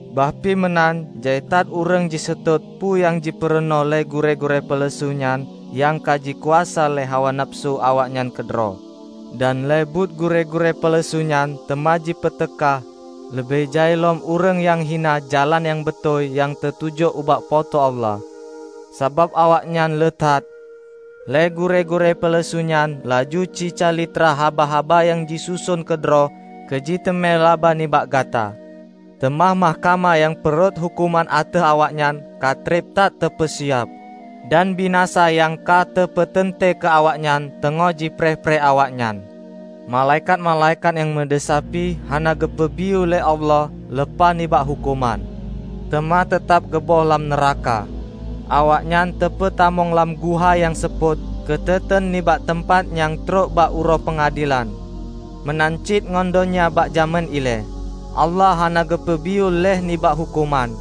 Bah pi meunan, jai that ureuëng jiseutôt peue nyang jipurunoe lé gurée-gurée peuleusu nyan nyang ka jikuasa lé hawa nafeusu awaknyan keudroe. Dan lé buet gurée-gurée peuleusu nyan teuma jipeuteuka leubeh jai lom ureuëng nyang hina Jalan nyang Beutôi nyang teutuju ubak Po teu Allah. Sabab awaknyan leuha that, lé gurée-gurée peuleusu nyan laju jicalitra haba-haba nyang jisuson keudroe keujiteumé laba nibak gata. Teuma mahkamah nyang peurhot huköman ateueh awaknyan ka treb that teupeusiab, dan binasa nyang ka teupeuteuntée keu awaknyan teungoh jipreh-preh awaknyan. Malaikat-malaikat nyang meudesya pih hana geupeubiyeu lé Allah leupah nibak huköman, teuma teutab geuböih lam nuraka. Awaknyan teupeutamong lam guha nyang seupôt keuteuteun nibak teumpat nyan trok bak Uroe Peungadelan. Meunan cit ngon donya bak jamén ilée, Allah hana geupeubiyeu lheueh nibak huköman.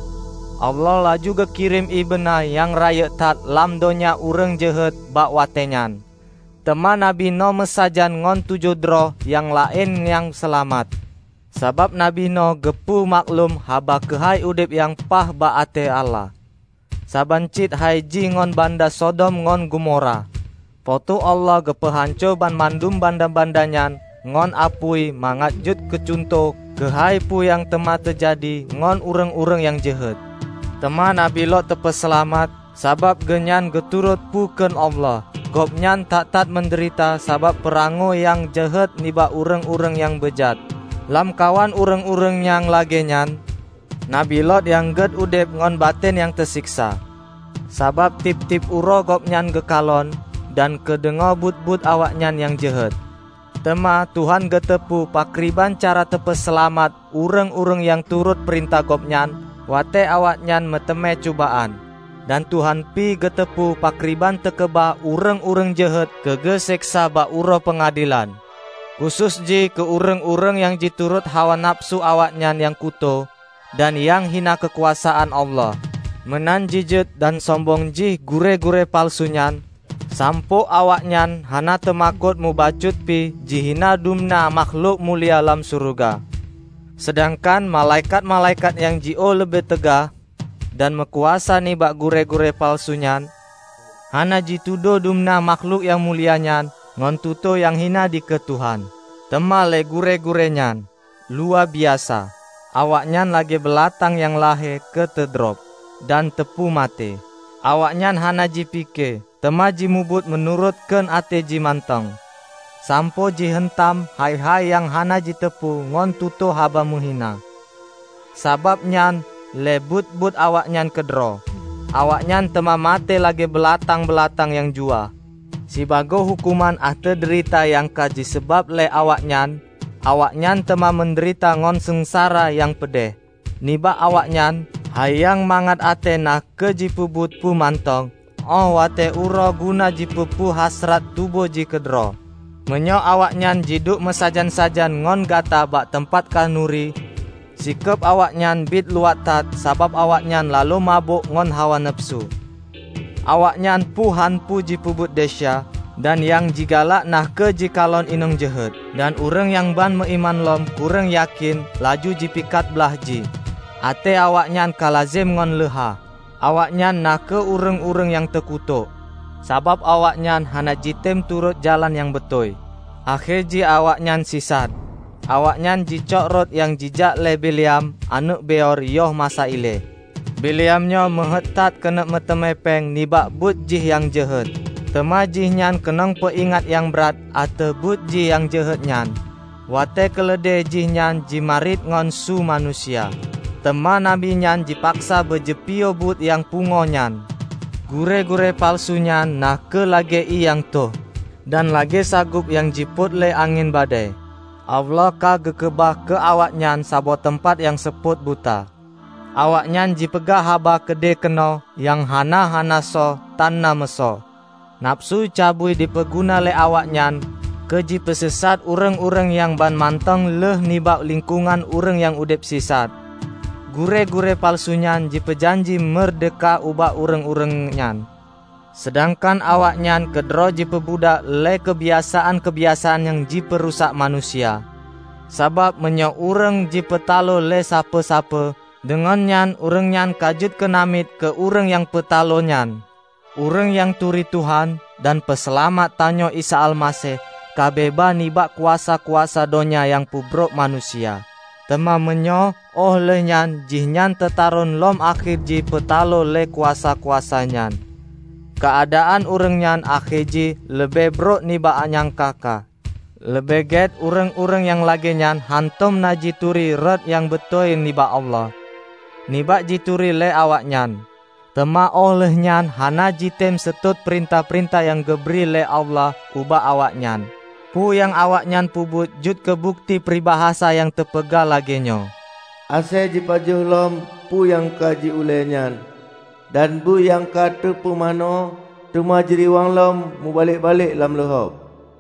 Allah laju geukirém ié beuna nyang rayeuk that lam donya ureuëng jeuhet bak watée nyan. Teuma Nabi Noh meusajan ngon tujoh droe nyang laén nyang seulamat, sabab nabi Noh geupeu maklum haba keuhai udeb nyang paih bak até Allah. Saban cit hai jih ngon banda Sodom ngon Gomora: Po teu Allah geupeuhanco banmandum banda-banda nyan ngon apui mangat jeuet keucuntoh keuhai peue nyang teuma teujadi ngon ureuëng-ureuëng nyang jeuhet. Teuma Nabi Lot teupeuseulamat, sabab geuhnyan geuturot peue kheun Allah; gobnyan that-that meudeurita sabab peurangoe nyang jeuhet nibak ureuëng-ureuëng nyang beujat. Lamkawan ureuëng-ureuëng nyang lagée nyan, nabi Lot nyang gét udeb ngon baten nyang teuseksa, sabab tieb-tieb uroe gobnyan geukalon dan geudeungoe buet-buet awaknyan nyang jeuhet. Teuma, Tuhan geuteupeue pakriban cara teupeuseulamat ureuëng-ureuëng nyang turot peurintah Gobnyan watée awaknyan meuteumé cubaan. Dan Tuhan pih geuteupeue pakriban teukeubah ureuëng-ureuëng jeuhet keu geuseksa bak Uroe Peungadelan, khusos jih keu ureuëng-ureuëng nyang jiturot hawa nafeusu awaknyan nyang kutoe dan nyang hina keukuasaan Allah. Meunan jijeuet dan sombong jih gurée-gurée peuleusu nyan sampoe awaknyan hana teumakot mubacut pi jihina dumna mahklok mulia lam syeuruga! Seudangkan malaikat-malaikat nyang jiôh leubeh teuga dan meukuasa nibak gurée-gurée peuleusu nyan, hana jitudôh dumna makhlok nyang mulia nyan ngon tutoe nyang hina dikeue Tuhan. Teuma lé gurée-gurée nyan, luwabiasa! Awaknyan lagée beulatang nyang lahé keu teudrob dan teupoh maté. Awaknyan hana jipike, teuma jimubuet meunurot kheun até jih mantong, sampoe jiheuntam hai-hai nyang hana jiteupeue ngon tutoe haba meuhina. Sabab nyan lé buet-buet awaknyan keudroe, awaknyan teuma maté lagée beulatang-beulatang nyang juwah. Sibagoe huköman ateueh deurita nyang ka jipeusabab lé awaknyan, awaknyan teuma meudeurita ngon seungsara nyang peudeh. Nibak awaknyan, hai nyang mangat até na kheueh jipeubuet peue mantong óh watée uroe guna jipeupuih hasrat tuboh jih keudroe. Meunyoe awaknyan jiduek meusajan-sajan ngon gata bak teumpat khanuri, sikeub awaknyan biet luwat that sabab awaknyan laloe mabök ngon hawa nafeusu. Awaknyan puih hán puih jipeubuet desya, dan nyang jigalak na kheueh jikalon inong jeuhet. Dan ureuëng nyang ban meuiman lom kureueng yakén, laju jipakat blaih jih. Até awaknyan ka lazem ngon leuha. Awaknyan na kheueh ureuëng-ureuëng nyang teukutok! Sabab awaknyan hana jitem turot jalan nyang beutôi, akhé jih awaknyan sisat. Awaknyan jicok rot nyang jijak lé Bileam aneuëk Beor yoh masa ilée. Bileam nyoe meuheuét that keuneuk meuteumé péng nibak buet jih nyang jeuhet. Teuma jihnyan keunong peuingat nyang brat ateueh buet jih nyang jeuhet nyan, watée keuleudée jihnyan jimarit ngon su manusia. Teuma nabi nyan jipaksa beujipiôh buet nyang pungoe nyan. Gurée-gurée peuleusu nyan na kheueh lagée ié nyang tho dan lagée sagob nyang jipôt lé angén badée. Allah ka geukeubah keu awaknyan saboh teumpat nyang seupôt buta. Awaknyan jipeugah haba keudeuh keunoe nyang hana-hana sôh tanna meuasoe; nafeusu cabui jipeuguna lé awaknyan keujipeusisat ureuëng-ureuëng nyang banmantong lheueh nibak lingkongan ureuëng nyang udeb sisat. Gurée-gurée peuleusu nyan jipeujanji meurdehka ubak ureuëng-ureuëng nyan, seudangkan awaknyan keudroe jipeubudak lé keubiasaan-keubiasaan nyang jipeurusak manusia. Sabab meunyoe ureuëng jipeutaloe lé sapeue-sapeue, deungon nyan ureuëng nyan ka jeuet keu namiet keu ureuëng nyang peutaloe nyan. Ureuëng nyang turi Tuhan dan Peuseulamat tanyoe Isa Almaseh ka beubaih nibak kuasa-kuasa donya nyang peubrôk manusia. Teuma meunyoe óh lheueh nyan jihnyan teutaron lom akhé jih jipeutaloe lé kuasa-kuasa nyan, keuadaan ureuëng nyan akhé jih leubeh brok nibak nyangka-ka. Leubeh gét ureuëng-ureuëng nyang lagée nyan hántom na jituri rot nyang beutôi nibak Allah, nibak jituri lé awaknyan, teuma óh lheueh nyan hana jitem seutôt peurintah-peurintah nyang geubri lé Allah ubak awaknyan. Peue nyang awaknyan peubuet jeuet keubukeuti pribasa nyang teupeugah lagée nyoe, "Asée jipajoh lom peue nyang ka jiulée nyan" dan "Bui nyang ka teupeumanö, teuma jiriwang lom meubalek-balek lam luhob."